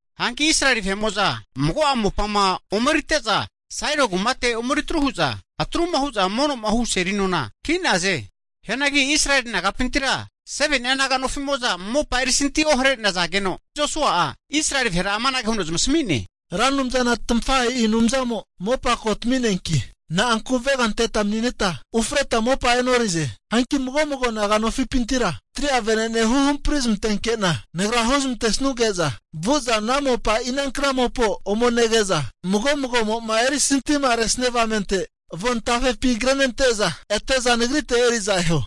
Hanki Israeli vahe'mo'za mago'a mopama omerite'za Sailo kumate omeritru hu'za, atruma hu'za mono'ma hu seli nona ki'naze. Hianagi Israeli naga'pintira 7ni'a naga nofi'mo'za mopa erisanti ohare'nazageno, Josua'a Israeli vahera amanage huno zamasami'ne, Ra Anumzana tamafahe'i Anumzamo mopa ko tami'neanki, na'anku avega anteta mani'neta ufreta mopa e'norize? Hanki mago'mago naga nofipintira 3'a vene'ne hu hamprizmantenke'na nagra hu zamantesuge'za vu'za ana mopa inankna mopao ome nege'za, mago mago'mo'ma erisantima haresia avamente avon tafepi krenente'za ete'za nagrite eri'za eho.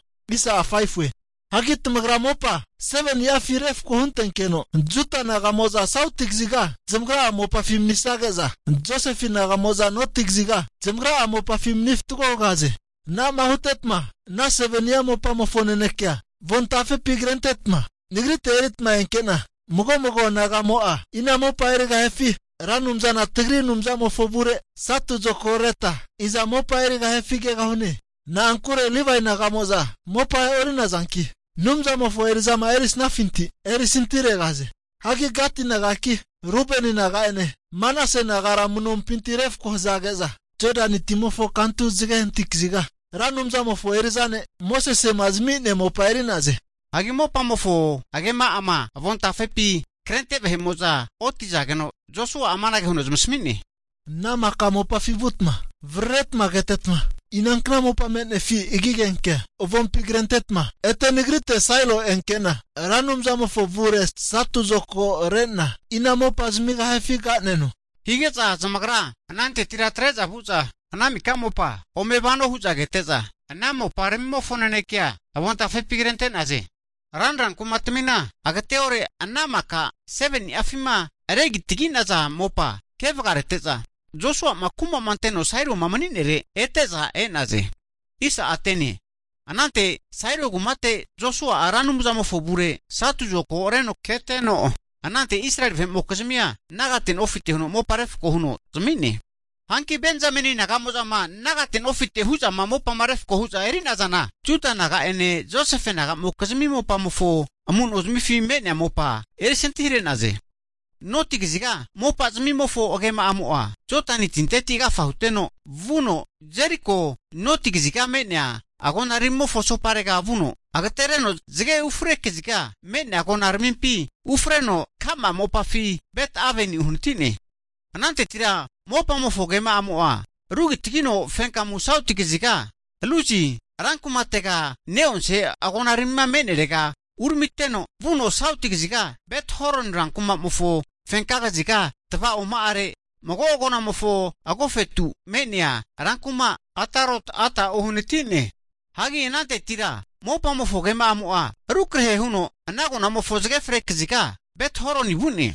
Hagi tamagra mopa 7ni'afi refko huntenkeno, Juda naga'mo'za sauti kaziga zamagra'a mopafi manisage'za, Josefe naga'mo'za noti kaziga zamagra'a mopafi mani fatgo hugahaze. Anama hutetma ana 7ni'a mopamofo naneke'a avon tafepi kretetma, nagrite eritma enke'na mago mago nagamo'a ina mopa erigahifi, Ra Anumzana tagri Anumzamofo avure satu zokagoreta iza mopa erigahifi kegahune. Na'ankure Livae naga'mo'za mopa e'ori'nazanki, Anumzamofo eri'zama erisnafinti erisantiharegahaze. Hagi Gati nagaki, Rubeni naga'ene, Manase nagara amu'nompinti refko hazage'za, Jodani timofo kantu zage hanati kaziga, Ra Anumzamofo eri'za ne' Mosese'ma zami'nea mopa eri'naze. Hagi mopamofo agema'ama avontafepi krente vahe'mo'za otizageno, Josua'a amanage huno zamasami'ne, ana maka mopafi vutma vararetma ketetma, inankna mopa me'nefi agi agenkea avompi krentetetma ete nagrite Sailo enke'na, Ra Anumzamofo avure satu zokagore'na, ina mopa zamigahifi ka'neno. Hige'za zamagra anantetira atre'za vu'za ana mika mopa ome vano hu'za kete'za, ana moparamimofo nanekea avontafepi krente'naze. Ranra kumatmina agateore ana maka 7ni'afima regitagi'naza mopa ke vagarete'za, Josua'ma kuma'ma anteno Sailoma mani'nere ete'za e'naze. Anante Sailo kumate Josua'a Ra Anumzamofo avure satu zokago reno keteno, anante Israeli vahe'mokizmia nagate nofite huno mopa refko huno zami'ne. Hanki Benzameni naga'mo'zama nagate nofite hu'zama mopama refko hu'za eri'nazana, Juda naga'ene Josefe naga'mokizmi mopamofo amu'nozmifi me'nea mopa erisantihare'naze. Noti kaziga mopazmimofo agema'amo'a Jodani tinteti agafa huteno vuno, Jeriko noti kaziga me'nea agonaramimofo asoparega vuno, agatereno zage ufre kaziga me'nea agonaramimpi ufreno ka'ma mopafi Bet Aveni uhanati'ne. Anantetira mopamofo agema'amo'a rugitagino fenkamu sauti kaziga Luzi (menina Betelie nehaze) ran kumatega ne'onse agonarami me'nerega uramiteno, vuno sauti kaziga Bet Horon rankuma'mofo fenka kaziga tava'oma'are mago agonamofo agofetu me'nea rankuma Atarot Ada uhanati'ne. Hagi anantetira mopamofo agema'amo'a rukrahe huno ana agonamofo zage ufre kaziga Bethoroni vu'ne.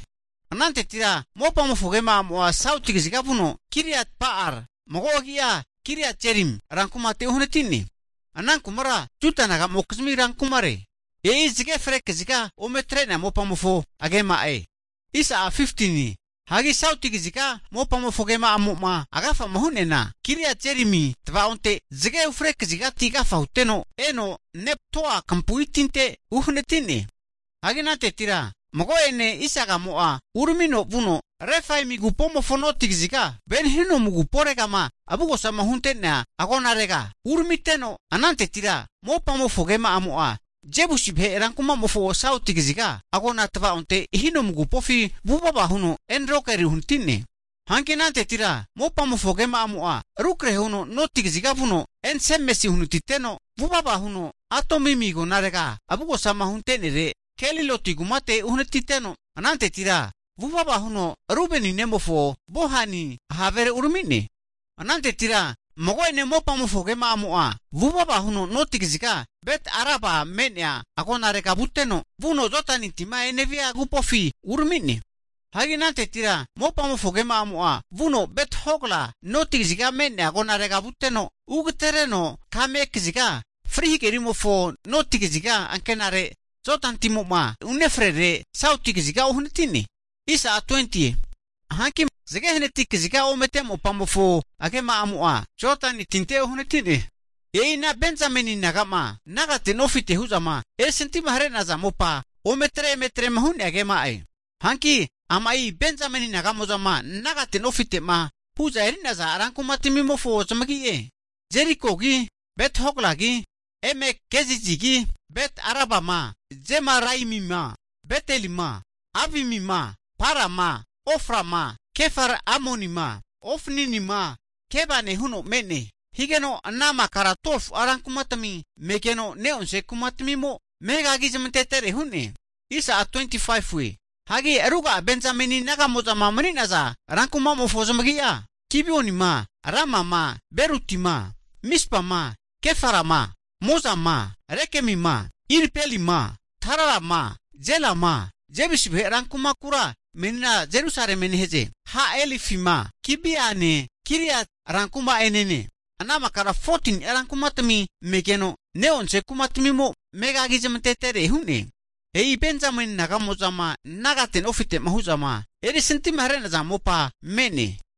Anantetira mopamofo agema'amo'a sauti kaziga vuno Kiriat Ba'al (mago agi'a Kiriat Jearim) rankumate uhanati'ne, ana kumara Juda nagamokizmi ran kumare. E'i zage ufre kaziga ome atre'nea mopamofo agema'e. Hagi sauti kaziga mopamofo agema'amo'ma agafama hu'neana, Kiriat Jearimi tavaonte zage ufre kazigati agafa huteno, eno Neptoa kampu'i tinte uhanati'ne. Hagi anantetira mago'ene isagamo'a uramino vuno Refaimi agupomofo noti kaziga Ben Hinomu aguporegama avugosa hunte'nea agonarega uramiteno, anantetira mopamofo agema'amo'a Jebusi vahe rankuma'mofo sauti kaziga agona tava'onte Hinomu agupofi vuvava huno En-Rogel uhanati'ne. Hanki anantetira mopamofo agema'amo'a rukrahe huno noti kaziga vuno En-Semesi uhanatiteno, vuvava huno Adumimi agonarega avugosama hunte'nere Geliloti kumate uhanatiteno, anantetira vuvava huno Rubeni nemofo Bohani havere urami'ne. Anantetira mago'ene mopamofo agema'amo'a vuvava huno noti kaziga Bet Araba me'nea agonarega vuteno, vuno Jodani tima enevia agupofi urami'ne. Hagi anantetira mopamofo agema'amo'a vuno Bet-Hogla noti kaziga me'nea agonarega vuteno, ugatereno kame kaziga Fri Hagerimofo noti kaziga ankenare Jodani timo'ma unefrere sauti kaziga uhanati'ne. Hanki zage hanati kaziga omete mopamofo agema'amo'a, Jodani tinte uhanatine. E'i Benjamin naga'ma nagate nofite hu'zama erisantimahare'naza mopa ometre emetrema hu'nea agema'e. Hanki ama'i Benjamini naga'mo'zama nagate nofite'ma hu'za eri'naza rankumatamimofo zamagi'e, Jerikogi, Bet-Hoglagi, Emek-Kezizigi, Bet-Arabama, Zemaraimima, Betelima, Avimima, Parama, Oframa, Kefar-Amonima, Ofninima Gebane huno me'ne. Higeno ana makara 12fu'a rankumatami megeno, ne'onse kumatamimo megagi zmantetere hu'ne. Hagi ruga'a Benzameni naga'mo'zama mani'naza rankumatamimofo zamagi'a, Gibionima, Ramama, Birotima, Mispama, Kefirama, Mozama, Rekemima, Irpelima, Taralama, Zelama, Jebusi vahe rankuma (menina Jerusalemie nehaze) Ha-Elefima, Gibeane Kiriati rankuma'enene, ana makara 14ni'a rankumatami megeno, ne'onse kumatamimo megagi zamante'tere hu'ne. E'i Benzameni naga'mo'zama nagate nofite'ma hu'zama erisantimahare'naza mopa me'ne.